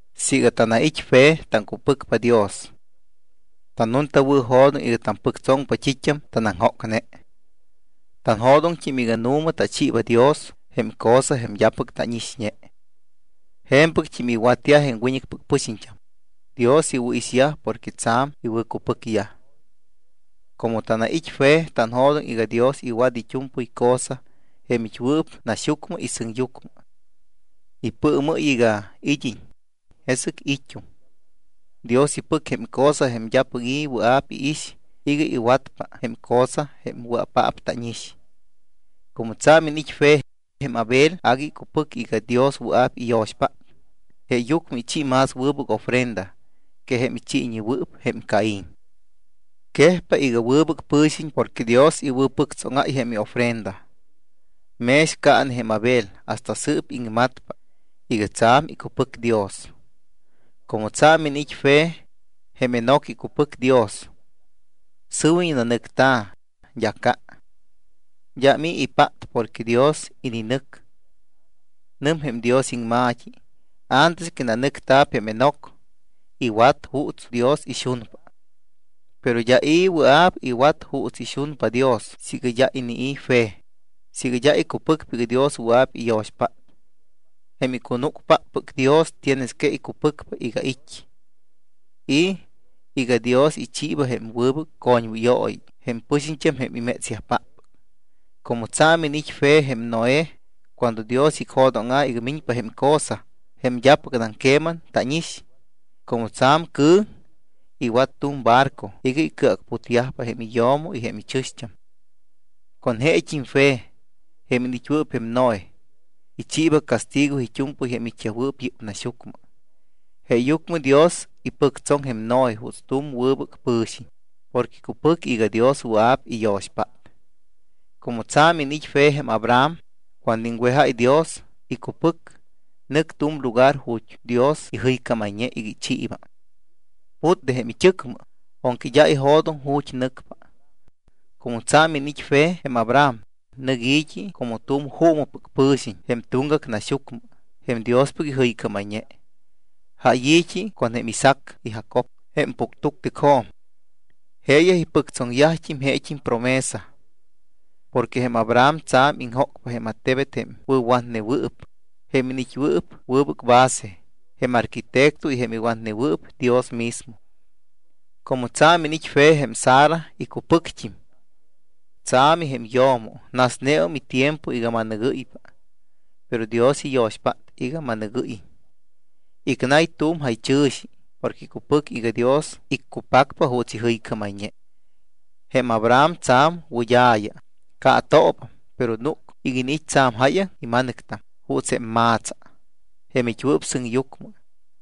Siiga tanait́ fe, taŋcupɨcpa Dios, tannuntawɨ̱jo̱doŋ iga tampɨctsoŋpa t́it́am tanaŋjócne. Tanjo̱doŋt́im iga nu̱ma tachiiba Dios jém cosa jém d́apɨc tánixñe. Je̱mpɨct́im iwatyaj jém wiñɨcpɨc pɨxiñt́am, Dios iwɨ̱ixyaj porque tsa̱m icupɨcyaj. Como tanait́ fe, tanjo̱doŋ iga Dios iwat it́u̱mpɨy cosa jém it́wɨɨp naxyucmɨ y sɨŋyucmɨ. Ipɨɨmɨ́y iga id́iñ, jesɨc it́um. Dios ipɨc jém cosa jém d́apɨc i̱ wɨa̱p iix iga iwatpa jém cosa jém wɨa̱paap tánix. Como tsa̱m iniit́ fe, jém Abel agui icupɨc iga Dios wɨa̱p iyo̱xpát, jeeyucmɨ ichi más wɨbɨc ofrenda que jém ichiiwɨɨp jém Caín. Quejpa iga wɨbɨc pɨ̱xiñ porque Dios iwɨ̱pɨctsóŋáy jém iofrenda. Mex caane jém Abel, hasta sɨɨp iŋmatpa iga tsa̱m icupɨc Dios. Como tsa̱m iniit́ fe, jém Enoc icupɨc Dios. Sɨwiñ nanɨcta̱, d́a ca. D́am i̱ ipát porque Dios ininɨc. Nɨm jém Dios iŋma̱t́i: “Antes que nanɨcta̱p jém Enoc, iwat juuts Dios ixunpa.” Pero d́a i̱ wɨa̱p iwat juuts ixunpa Dios siiga d́a inii̱ fe, siiga d́a icupɨcpa iga Dios wɨa̱p iyo̱xpát. Jém icunúcpáppɨc Dios tienes que icupɨcpa iga it́, y iga Dios ichiiba jém wɨbɨc coñwɨyooyi jém pɨxiñt́am jém imétsyajpáppɨc. Como tsa̱m iniit́ fe jém Noé, cuando Dios icjo̱dóŋa̱ iga miñpa jém cosa jém d́apɨcnam queman tánix, como tsa̱m cɨ̱ŋ, iwat tu̱m barco iga icɨacputyajpa jém iyo̱mo y jém ichɨ̱xt́am. Con jeet́im fe, jém iniit́wɨɨp jém Noé, ichiiba castigo it́u̱mpɨy jém it́yajwɨɨp yɨ́p naxyucmɨ. Jeeyucmɨ Dios ipɨctsoŋ jém Noé juuts tu̱m wɨbɨc pɨ̱xiñ porque icupɨc iga Dios wɨa̱p iyo̱xpát. Como tsa̱m iniit́ fe jém Abraham, cuando iŋwejáy Dios, icupɨc, nɨc tu̱m lugar ju̱t́ Dios ijɨycámayñe iga ichiiba. Put de jém it́ɨcmɨ, aunque d́a ijo̱doŋ ju̱t́ nɨcpa. Como tsa̱m iniit́ fe jém Abraham, nɨc i̱t́i como tu̱m juumɨpɨc pɨ̱xiñ jém tuŋgac naxyucmɨ jém Diospɨc ijɨycámayñe. Jáy i̱t́i con jém Isaac y Jacob jém puctuctɨcjo̱m. Jeeyaj ipɨctsoŋyajt́im jeet́im promesa. Porque jém Abraham tsa̱m iŋjócpa jém attebet jém wɨ̱watnewɨɨp, jém iniit́wɨɨp wɨbɨc base, jém arquitecto y jém iwatnewɨɨp Dios mismo. Como tsa̱m iniit́ fe jém Sara, icupɨcpat́im. Tsa̱mi jém yo̱mo, nasneum itiempo iga ma̱nɨgɨ́ypa, pero Dios iyo̱xpát iga ma̱nɨgɨ́yiñ. Icnay tu̱m jaychɨ̱xi porque icupɨc iga Dios iccupacpa juuts ijɨycámayñe. Jém Abraham tsa̱m wɨd́a̱ya, caatoobam, pero núc iga iniit́ tsa̱m jáyaŋ ima̱nɨctam juuts jém ma̱tsa, jém it́wɨɨp sɨŋyucmɨ,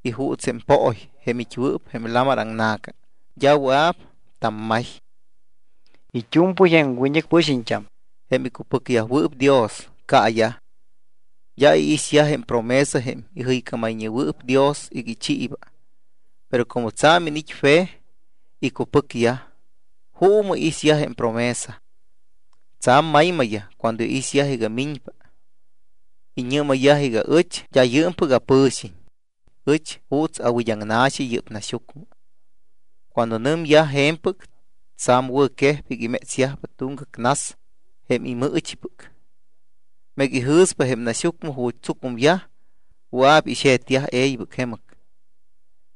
y juuts jém pooy, jém it́wɨɨp jém lamar aŋna̱ca, d́a wɨa̱p tammay. It́u̱mpɨy jém wiñɨcpɨc pɨxiñt́am, jém icupɨcneyajwɨɨp Dios, caayaj. D́a iixyaj jém promesa jém ijɨycámayñewɨɨp Dios iga ichiiba. Pero como tsa̱m iniit́ fe, icupɨcyaj, juumɨ iixyaj jém promesa. Tsa̱m maymayyaj cuando iixyaj iga miñpa. Iñɨ́mayyaj iga: “Ɨch d́a yɨɨmpɨc apɨ̱xiñ. Ɨch juuts awid́aŋna̱xi yɨ́p naxyucmɨ.” Cuando nɨmyaj je̱mpɨc, tsa̱m wɨ̱quejpa iga imétsyajpa tuŋgac nas jém imɨɨchipɨc. Meega ijɨ̱syaj jém naxyucmɨ ju̱t́ tsucumyaj, wɨa̱p ixe̱tyaj e̱ybɨc jemɨc.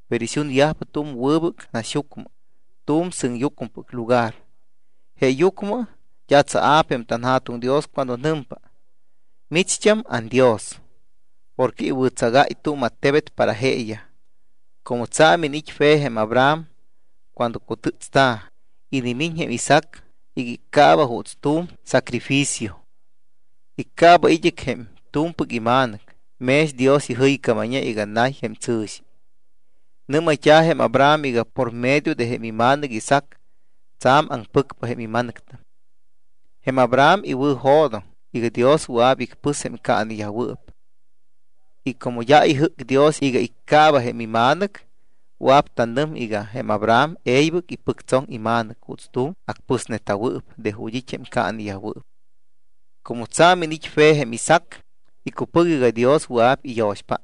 Pero ixunyajpa tu̱m wɨbɨc naxyucmɨ, tu̱m sɨŋyucmɨpɨc lugar. Jeeyucmɨ d́a tsaa̱p jém tanJa̱tuŋ Dios cuando nɨmpa: Micht́am anDios. Porque iwɨ̱tsagáy tu̱m attebet para jeeyaj. Como tsa̱m iniit́ fe jém Abraham, cuando cutɨ́tsta̱, inimiñ jém Isaac iga iccaaba juuts tu̱m sacrificio. Iccaaba id́ɨc jém t́u̱mpɨc ima̱nɨc mex Dios ijɨycámayñe iga nay jém tsɨ̱xi. Nɨ́mayt́a̱ jém Abraham iga por medio de jém ima̱nɨc Isaac, tsa̱m aŋpɨcpa jém imma̱nɨctam. Jém Abraham iwɨ̱jo̱doŋ iga Dios wɨa̱p icpɨs jém caaneyajwɨɨp. Y como d́a ijɨ́c Dios iga iccaaba jém ima̱nɨc, wɨa̱p tanɨm iga jém Abraham e̱ybɨc ipɨctsoŋ ima̱nɨc juuts tu̱m acpɨsneta̱wɨɨp de ju̱t́ it́ jém caaneyajwɨɨp. Como tsa̱m iniit́ fe jém Isaac, icupɨc iga Dios wɨa̱p iyo̱xpát.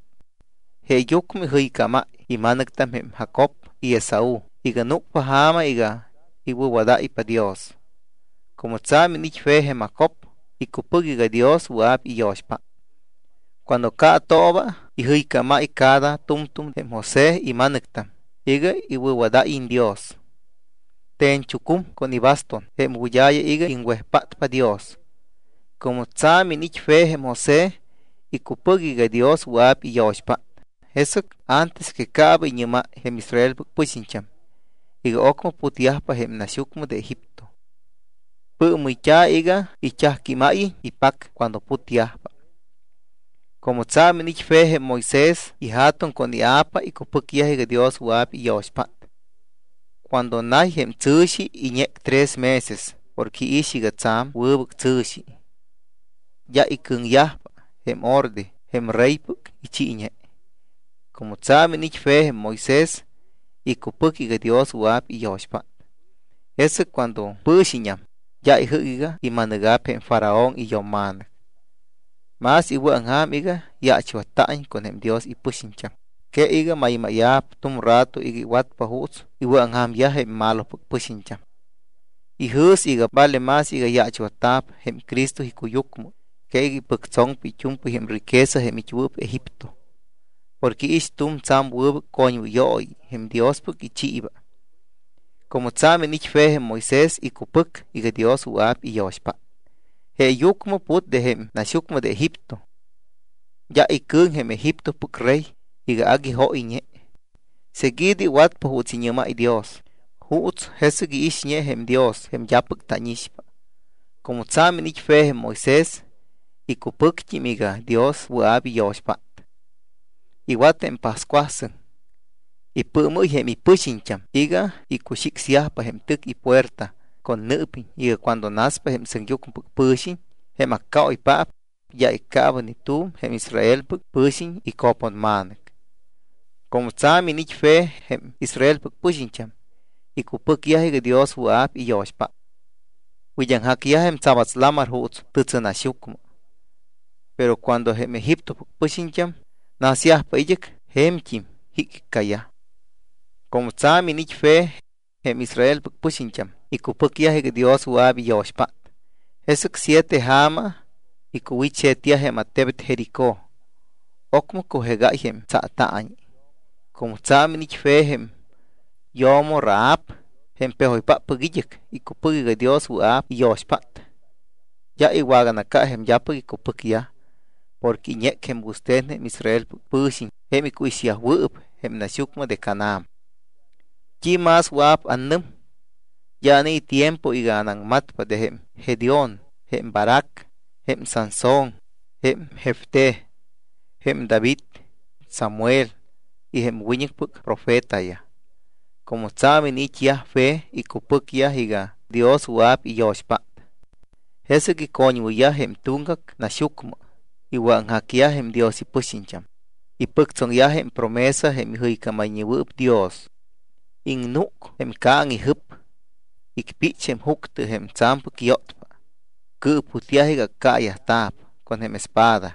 Jeeyucmɨ ijɨycámáy ima̱nɨctam jém Jacob y Esaú iga núcpa ja̱ma iga iwɨ̱wadáypa Dios. Como tsa̱m iniit́ fe Jém Jacob, icupɨc iga Dios wɨa̱p iyo̱xpát. Cuando caatooba ijɨycámáypa cada tu̱mtu̱m jém José ima̱nɨctam iga iwɨ̱wadáyiñ Dios. Te̱ñchucum con ibaston jém wɨd́a̱ya iga iŋwejpátpa Dios. Como tsa̱m iniit́ fe jém José, icupɨc iga Dios wɨa̱p iyo̱xpát, jesɨc antes que caaba iñɨ́máy jém Israelpɨc pɨxiñt́am iga ocmɨ putyajpa jém naxyucmɨ de Egipto. Pɨɨmɨyyajta̱ iga it́ajquímáyiñ ipac cuando putyajpa. Como tsa̱m iniit́ fe jém Moisés ija̱tuŋ con ia̱pa, icupɨcyaj iga Dios wɨa̱p iyo̱xpát. Cuando nay jém tsɨ̱xi, iñec tres meses porque iix iga tsa̱m wɨbɨc tsɨ̱xi. D́a icɨ̱ŋyajpa jém orde, jém reypɨc ichiiñe. Como tsa̱m iniit́ fe jém Moisés, icupɨc iga Dios wɨa̱p iyo̱xpát, jesɨc cuando pɨ̱xiññam, d́a ijɨ́c iga ima̱nɨga̱p jém Faraón iyo̱mma̱nɨc. Más iwɨ̱aŋja̱m iga yaachwatta̱iñ con jém Dios ipɨxiñt́am que iga maymáya̱p tu̱m rato iga iwatpa juuts iwɨ̱aŋja̱myaj jém malopɨc pɨxiñt́am. Ijɨ̱s iga vale más iga yaachwatta̱p jém Cristo icuyucmɨ que iga ipɨctsoŋpa it́u̱mpɨy jém riqueza jém it́wɨɨp Egipto porque iix tu̱m tsa̱m wɨbɨc coñwɨyooyi jém Diospɨc ichiiba. Como tsa̱m iniit́ fe jém Moisés, icupɨc iga Dios wɨa̱p iyo̱xpát, jeeyucmɨ put de jém naxyucmɨ de Egipto. D́a icɨ̱ŋ jém Egiptopɨc rey iga agui jóyñe. Seguido iwatpa juuts iñɨ́máy Dios, juuts jesɨc iixñe jém Dios jém d́apɨc tánixpa. Como tsa̱m iniit́ fe jém Moisés, icupɨct́im iga Dios wɨa̱p iyo̱xpát. Iwat jém pascuasɨŋ. Ipɨɨmɨ́y jém ipɨxiñt́am iga icuxicsyajpa jém tɨc ipuerta con nɨɨpiñ iga cuando naspa jém sɨŋyucmɨpɨc pɨ̱xiñ, jém accaoypaap, d́a iccaaba ni tu̱m jém Israelpɨc pɨ̱xiñ ico̱ponma̱nɨc. Como tsa̱m iniit́yaj fe jém Israelpɨc pɨxiñt́am, icupɨcyaj iga Dios wɨa̱p iyo̱xpát. Wid́aŋjacyajpa jém tsabats lamar juuts tɨtsɨnaxyucmɨ. Pero cuando jém Egiptopɨc pɨxiñt́am nasyajpa id́ɨc, je̱mt́im jicjiccayaj. Como tsa̱m iniit́yaj fe, jém Israelpɨc pɨxiñt́am icupɨcyaj iga Dios wɨa̱p iyo̱xpát, jesɨc siete ja̱ma icuwit́xe̱tyaj jém attebet Jericó, ocmɨ cujegáy jém tsaataañi. Como tsa̱m iniit́ fe jém yo̱mo Rahab, jém pejoypáppɨc id́ɨc, icupɨc iga Dios wɨa̱p iyo̱xpát. D́a iwaganaca jém d́apɨc icupɨcyaj, porque iñec jém wɨste̱n jém Israelpɨc pɨ̱xiñ jém icuixyajwɨɨp jém naxyucmɨ de Canaán. ¿T́i más wɨa̱p annɨm? D́a anai̱ tiempo iga anaŋmatpa de jém Gedeón, jém Barac, jém Sansón, jém Jefté, jém David, jém Samuel y jém wiñɨcpɨc profetayaj. Como tsa̱m iniit́yaj fe, icupɨcyaj iga Dios wɨa̱p iyo̱xpát. Jesɨc icoñwɨyyaj jém tuŋgac naxyucmɨ, iwɨ̱aŋjacyaj jém Dios ipɨxiñt́am, ipɨctsoŋyaj jém promesa jém ijɨycámayñewɨɨp Dios, iŋnúc jém ca̱ŋ ijɨp. Icpích jém juctɨ jém tsa̱mpɨc yótpa, cɨɨputyaj iga accaayajta̱p con jém espada,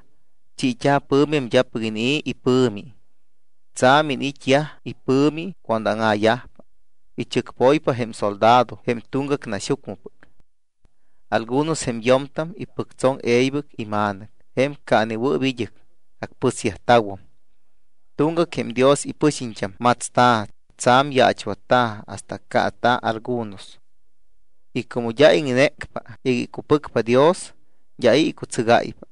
chiit́a̱ pɨ̱mi jém d́apɨc inii̱ ipɨ̱mi, tsa̱m iniit́yaj ipɨ̱mi cuando áŋa̱yajpa, ichɨcpoypa jém soldado jém tuŋgac naxyucmɨpɨc. Algunos jém yo̱mtam ipɨctsoŋ e̱ybɨc ima̱nɨc jém caanewɨɨp id́ɨc, acpɨsyajta̱wum. Tuŋgac jém Dios ipɨxiñt́am matsta̱, tsa̱m yaachwatta̱ hasta accaata̱ algunos. Y como d́a iŋnécpa iga icupɨcpa Dios, d́a i̱ icutsɨgáypa.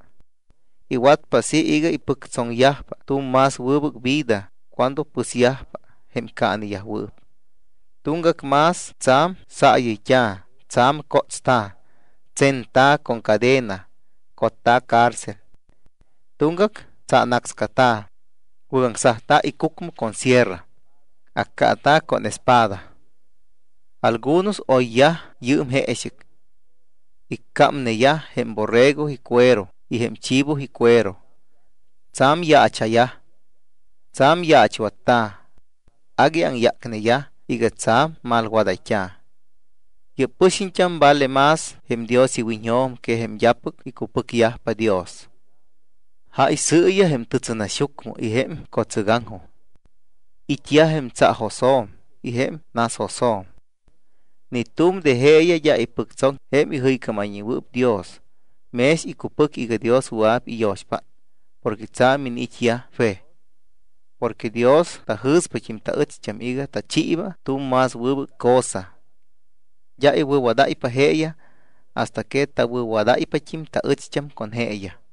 Iwatpa así iga ipɨctsoŋyajpa tu̱m más wɨbɨc vida cuando pɨsyajpa jém caaneyajwɨɨp. Tuŋgac más tsa̱m saayɨyt́a̱, tsa̱m cótsta̱, tsenta̱ con cadena, cotta̱ cárcel. Tuŋgac tsaanácscata̱, wɨ́gaŋsajta̱ icucmɨ con sierra, accaata̱ con espada. Algunos oyyaj yɨɨm jeexɨc. Iccámneyaj jém borrego icuero y jém chivo icuero. Tsa̱m yaacha̱yaj. Tsa̱m yaachwatta̱. Agui aŋyácneyaj iga tsa̱m malwadayt́a̱. Yɨ́p pɨxiñt́am vale más jém Dios iwiñjo̱m que jém d́apɨc icupɨcyajpa Dios. Jáy sɨiyaj jém tɨtsɨnaxyucmɨ y jém co̱tsɨgaŋjo̱. It́yaj jém tsaajosjo̱m y jém nasjosjo̱m. Ni tu̱m de jeeyaj d́a ipɨctsoŋ jém ijɨycámayñewɨɨp Dios mex icupɨc iga Dios wɨa̱p iyo̱xpát porque tsa̱m iniit́yaj fe. Porque Dios tajɨ̱spat́im taɨcht́am iga tachiiba tu̱m más wɨbɨc cosa. D́a iwɨ̱wadáypa jeeyaj hasta que tawɨ̱wadáypat́im taɨcht́am con jeeyaj.